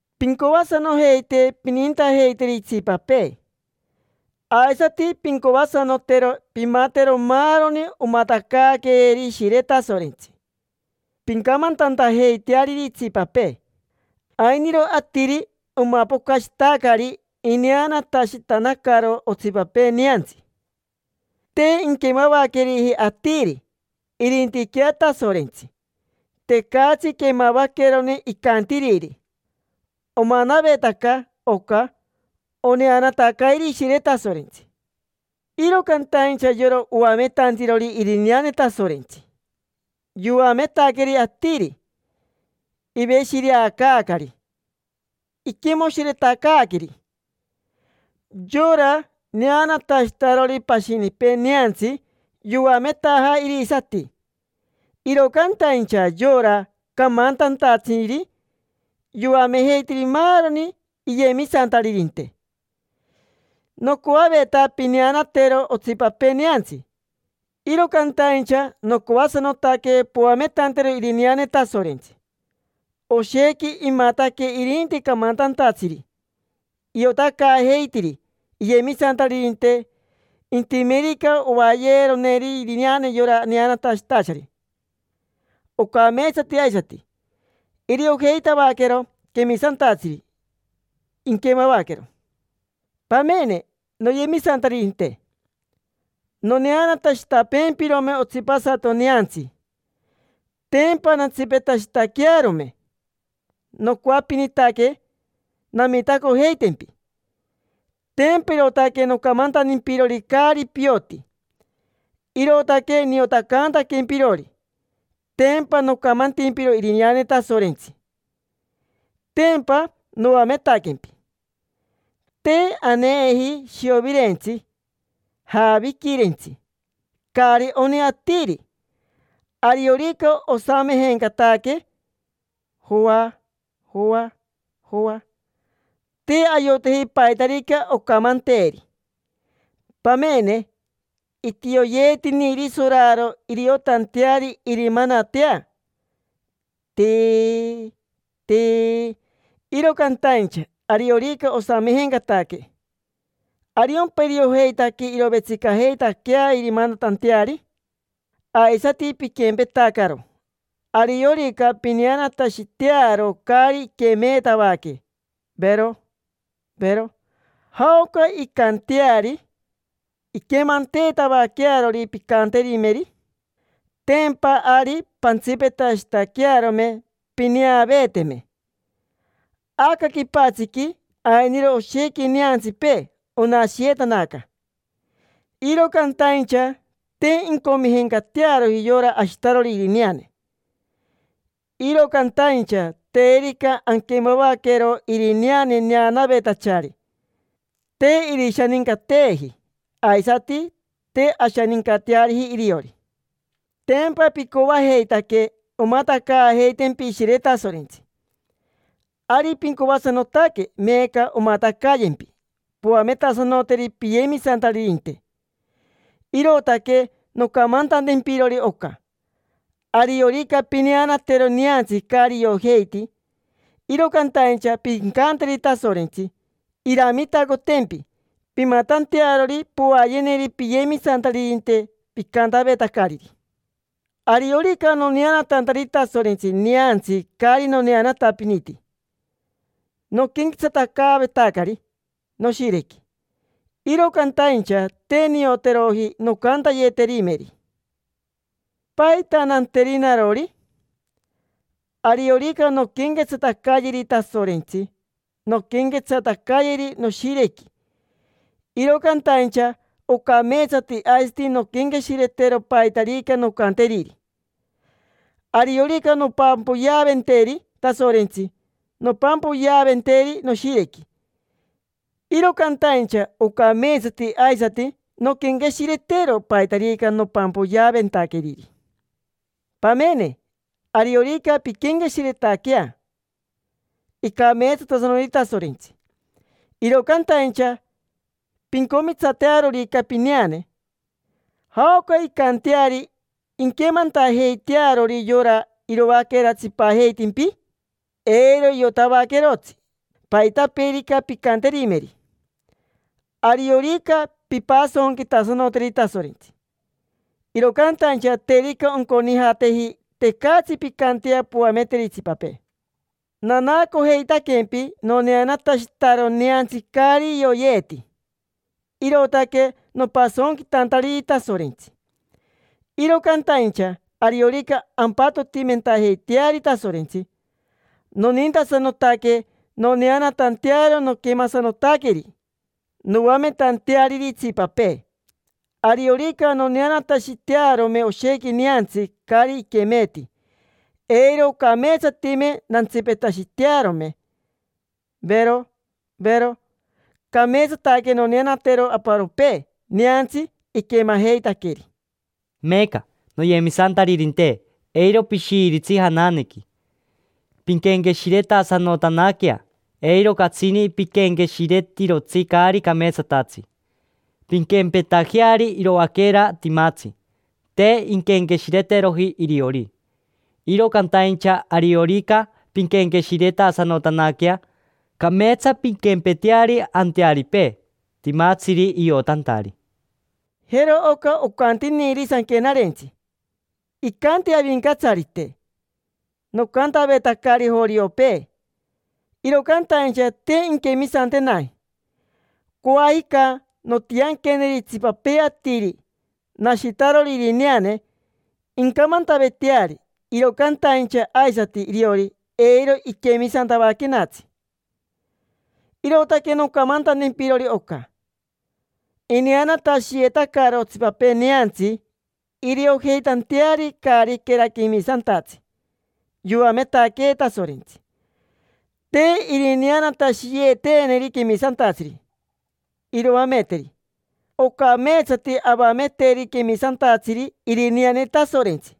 Pincoasanojeite pinintajeiteri itsipapee. Aisati pincoasanotero pimatero maaroni omatacaaqueeri Ishire Tasorentsi, pincamantantajeiteariri itsipapee. Ainiro atiri omapocashitacari ineanatashitanacaro otsipapee neantsi. Te inquemavaqueriji atiri, irintiquea Tasorentsi. Tecatsi quemavaquerone icantiriri. Omanavetaca oca oneanatacairi Ishire Tasorentsi. Iro cantaincha yora oametantirori irineane Tasorentsi, yoametaqueri atiri, iveshireacaacari, iquimoshiretacaaqueri. Yora neanatashitarori pashinipee neantsi yoametaja irisati, iro cantaincha yora camantantatsiri yoamejeitiri maaroni iyemisantaririnte. Nocoaveta pineanatero otsipapee neantsi, iro cantaincha nocoasanotaque poametantero irineane Tasorentsi. Oshequi imataque irinti camantantatsiri: iotacaajeitiri iyemisantaririnte. Intimerica ovaayeeroneri irineane yora neanatashitachari, ocameetsati aisati. Iriojeitavaquero quemisantatsiri, inquemavaquero. Pamene, noyemisantaririnte: noneanatashitapeempirome otsipasato neantsi, tempa nantsipetashitaquearome. Nocoapinitaque namitacojeitimpi, tempa irootaque nocamantantimpirori caari pioti, irootaque niotacaantaquempirori. Tempa nocamantimpiro irineane Tasorentsi. Tempa noametaquempi. Te aneeji shiovirentsi, jaaviquirentsi, caari oni atiri. Ariorica osamejencataque, joa, joa, joa, te ayoteji paitarica oncantemeri. Pamene, itioyeetiniri soraro iriotanteari irimanatea, tiii, tiii. Iro cantaincha ariorica osamejencataque, ¿ariompa iriojeitaque irovetsicajeitaquea irimanatanteari? Aisati piquempetacaro. Ariorica pineanatashitearo caari iquemeetavaque, vero, vero, ¿jaoca incanteari inquemanteetavaquearori pincanterimeri? Tempa ari pantsipetashitaquearome pineaveeteme. Aca quipatsiqui ainiro oshequi neantsipee. Onashiyetanaca, iro cantaincha te incomijencatearoji yora ashitarori irineane. Iro cantaincha terica anquemavaquero irineane neanavetachari, te irishanincateeji, aisati te ashanincateariji iriori. Tempa picoajeitaque omatacaajeitempi Ishire Tasorentsi, ari pincoasanotaque meeca omatacayempi poametasanoteri piyemisantaririnte. Irootaque noncamantantempirori oca: ariorica pineanatero neantsi caari iojeiti, iro cantaincha pincanteri Tasorentsi iramitacotempi pimatantearori povaayeneri piyemisantaririnte picantavetacariri. Ariorica noneanatantari Tasorentsi neantsi caari noneanatapiniti, noquenquetsatacaavetacari noshirequi, iro cantaincha te nioteroji noncantayeterimeri. ¿Paita nanteri narori? Ariorica nonquenquetsatacayeri Tasorentsi, nonquenquetsatacayeri noshirequi, iro cantaincha oncameetsate aisati nonquenqueshiretero paitarica noncanteriri. Ariorica nompampoyeaventeri Tasorentsi, nompampoyeaventeri noshirequi, iro cantaincha ocameetsati aisati nonquenqueshiretero paitarica nompampoyeaventaqueriri. Pamene, ariorica pinquenqueshiretaquea: “Icameetsatasanoti Tasorentsi”, iro cantaincha pincomitsatearorica pineane, ¿jaoca incanteari inquemantajeitearori yora iroaquera tsipajeitimpi? Eiro iotavaquerotsi paitapeerica pincanterimeri. Ariorica pimpasonquitasanoteri Tasorentsi, iro cantaincha terica onconijateji, tecatsi pincantea poameteri itsipapee. Nanaacojeitaquempi noneanatashitaro neantsi caari ioyeeti, irootaque nopasonquitantariri Tasorentsi. Iro cantaincha ariorica ampatotimentajeiteari Tasorentsi, nonintasanotaque noneanatantearo noquemasanotaqueri, noametanteariri itsipapee. Ariorica noneanatashitearome oshequi neantsi caari iquemeeti, eiro ocameetsatime. Nantsipetashitearome, vero, vero. Cameetsataque noneanatero aparopee neantsi iquemajeitaqueri. Meeca, noyemisantaririnte, eiro pishiiritsi jananequi: pinquenqueshiretasanotanaquea. Eiro catsini piquenqueshiretirotsi caari cameetsatatsi: pinquempetajeari iroaquera timatsi, te inquenqueshireteroji iriori. Iro cantaincha ariorica pinquenqueshiretasanotanaquea, cameetsa pinquempeteari antearipee, timatsiri iotantari. Jero oca ocantiniri Sanquenarentsi: “Icanti Avincatsarite: ‘Nocantavetacari joriopee, iro cantaincha te inquemisantenaji. Coajica nontianqueneri itsipapee atiri, nashitarori irineane, incamantaveteari, iro cantaincha aisati iriori, eiro iquemisantavaquenatsi’”. Irootaque noncamantantempirori oca: ineanatashiyeetacaro otsipapee neantsi iriojeitanteari caariquera quemisantatsi yoametaquee Tasorentsi. Te irineanatashiyeeteneri quemisantatsiri iroameteri. Ocameetsati avameteri quemisantatsiri irineane Tasorentsi.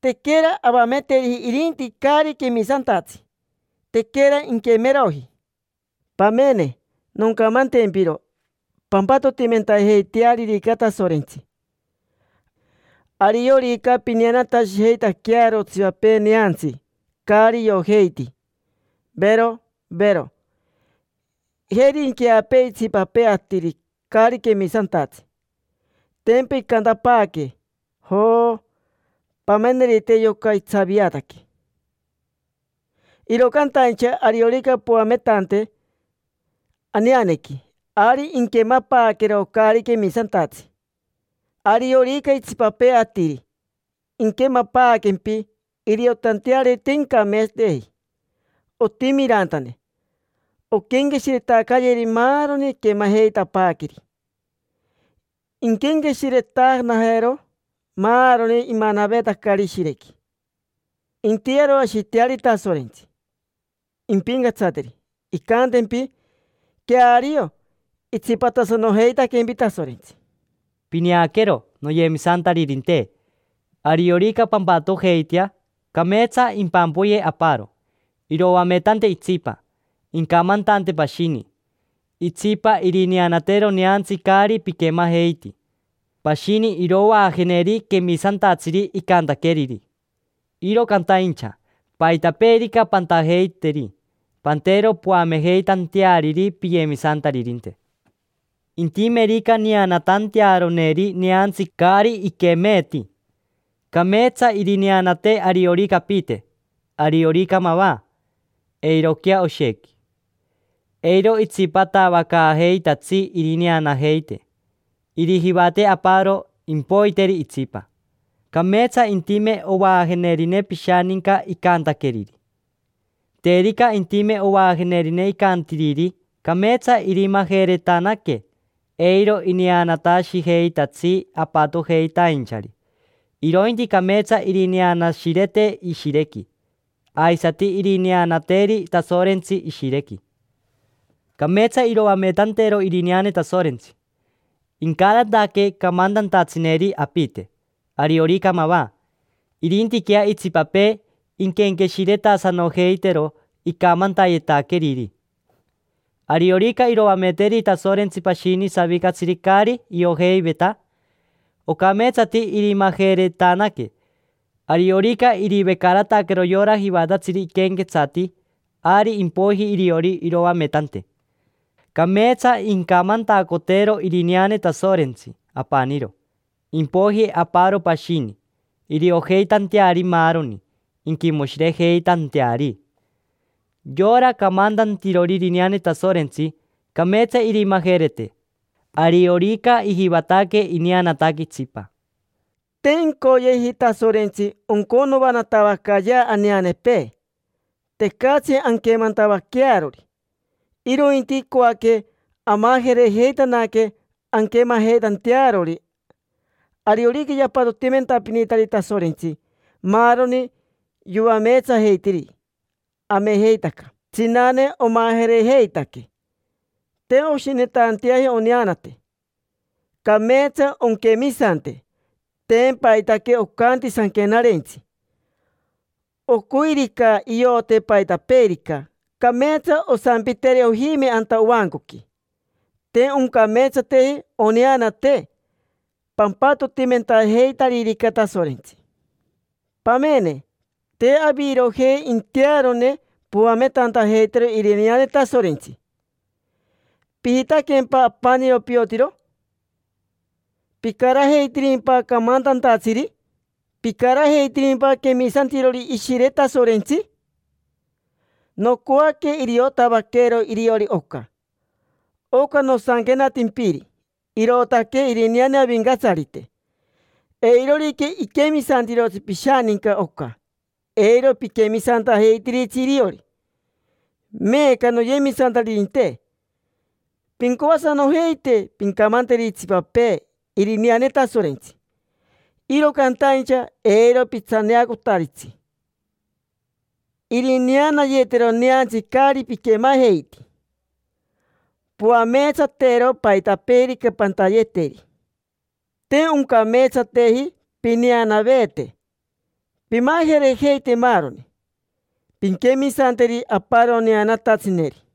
Tequera avameteriji irinti caari quemisantatsi: tequera inquemeroji. Pamene, noncamantempiro: pampatotimentajeitearirica Tasorentsi, ariorica pineanatashijeitaquearo otsipapee neantsi caari iojeiti: vero, vero. Jeri inqueapee itsipapee atiri, caari quemisantatsi; tempa incantapaaque: “Jo, pamenerite yoca, itsaviataque”. Iro cantaincha ariorica poametante aneanequi, ari inquemapaaquero caari quemisantatsi, ariorica itsipapee atiri. Inquemapaaquempi, iriotanteari te incameetsateji, otimi irantane. Onquenqueshiretacayeri maaroni iquemajeitapaaqueri. Inquenqueshiretanajero maaroni imanavetacari ishirequi. Intiyeroashiteari Tasorentsi, impincatsateri. Incantempi: “Queario, itsipatasanojeitaquempi Tasorentsi”. Pineaquero, noyemisantaririnte. Ariorica pampatojeitea, cameetsa impampoyee aparo, iroametante itsipa, incamantante pashini, itsipa irineanatero neantsi caari piquemajeiti, pashini irovaajeneri quemisantatsiri icantaqueriri. Iro cantaincha, paitapeerica pantajeiteri, pantero poamejeitanteariri piyemisantaririnte. Intimerica neanatantearoneri neantsi caari iquemeeti, cameetsa irineanate ariorica apite, ariorica mava: eiroquea oshequi. Eiro itsipatavacaajeitatsi irineanajeite. Irijivate aparo, impoiteri itsipa. Cameetsa intime ovaajenerine pishaninca icantaqueriri. Terica intime ovaajenerine icantiriri, cameetsa irimajeretanaque, eiro ineanatashijeitatsi apatojeitainchari, irointi cameetsa irineanashirete ishirequi, aisati irineanateri Tasorentsi ishirequi. Cameetsa iroametantero irineane Tasorentsi, incarataque camantantatsineri apite, ariorica mava. Irintiquea itsipapee, inquenqueshiretasanojeitero icamantayetaqueriri. Ariorica iroameteri Tasorentsi pashini savicatsiri caari iojeiveta, ocameetsati irimajeretanaque. Ariorica irivecarataquero yora jivatatsiri iquenquetsati, ari impoiji iriori iroametante. Cameetsa incamantacotero irineane Tasorentsi apaniro, impoiji aparo pashini, iriojeitanteari maaroni, inquimoshirejeitanteari. Yora camantantirori irineane Tasorentsi, cameetsa irimajerete, ariorica ijivataque ineanataque itsipa. Te incoyeji Tasorentsi onconoanatavacaayea aneanepee tecatsi anquemantavaquearori, irointi icoaque amajerejeitanaque anquemajeitantearori. Ariorica yapatotimentapinitari Tasorentsi maaroni yoameetsajeitiri, amejeitaca tsinane omajerejeitaque. Te oshinetanteaji oneanate. Cameetsa onquemisante, tempa aitaque ocanti Sanquenarentsi. Ocoirica iote paitapeerica, cameetsa osampiteri ojime anta ovancoqui. Te oncameetsateji oneanate pampatotimentajeitaririca Tasorentsi. Pamene, te avirojei intearone poametantajeitero irineane Tasorentsi. ¿Pijitaquempa apaniro piotiro? ¿Picarajeitirimpa camantantatsiri? ¿Picarajeitirimpa quemisantirori Ishire Tasorentsi? Nocoaque iriotavaquero iriori oca: oca nosanquenatimpiri, irootaque irineane Avincatsarite. Eirorica iquemisantirotsi pishaninca oca, eiro piquemisantajeitiritsi iriori. Meeca, noyemisantaririnte, pincoasanojeite pincamanteri itsipapee irineane Tasorentsi. Iro cantaincha eiro pitsaneacotaritsi irineanayeetero neantsi caari piquemajeiti. Poameetsatero paitapeerica pantayeteri. Te oncameetsateji pineanaveete: pimajerejeite maaroni, pinquemisanteri aparo neanatatsineri.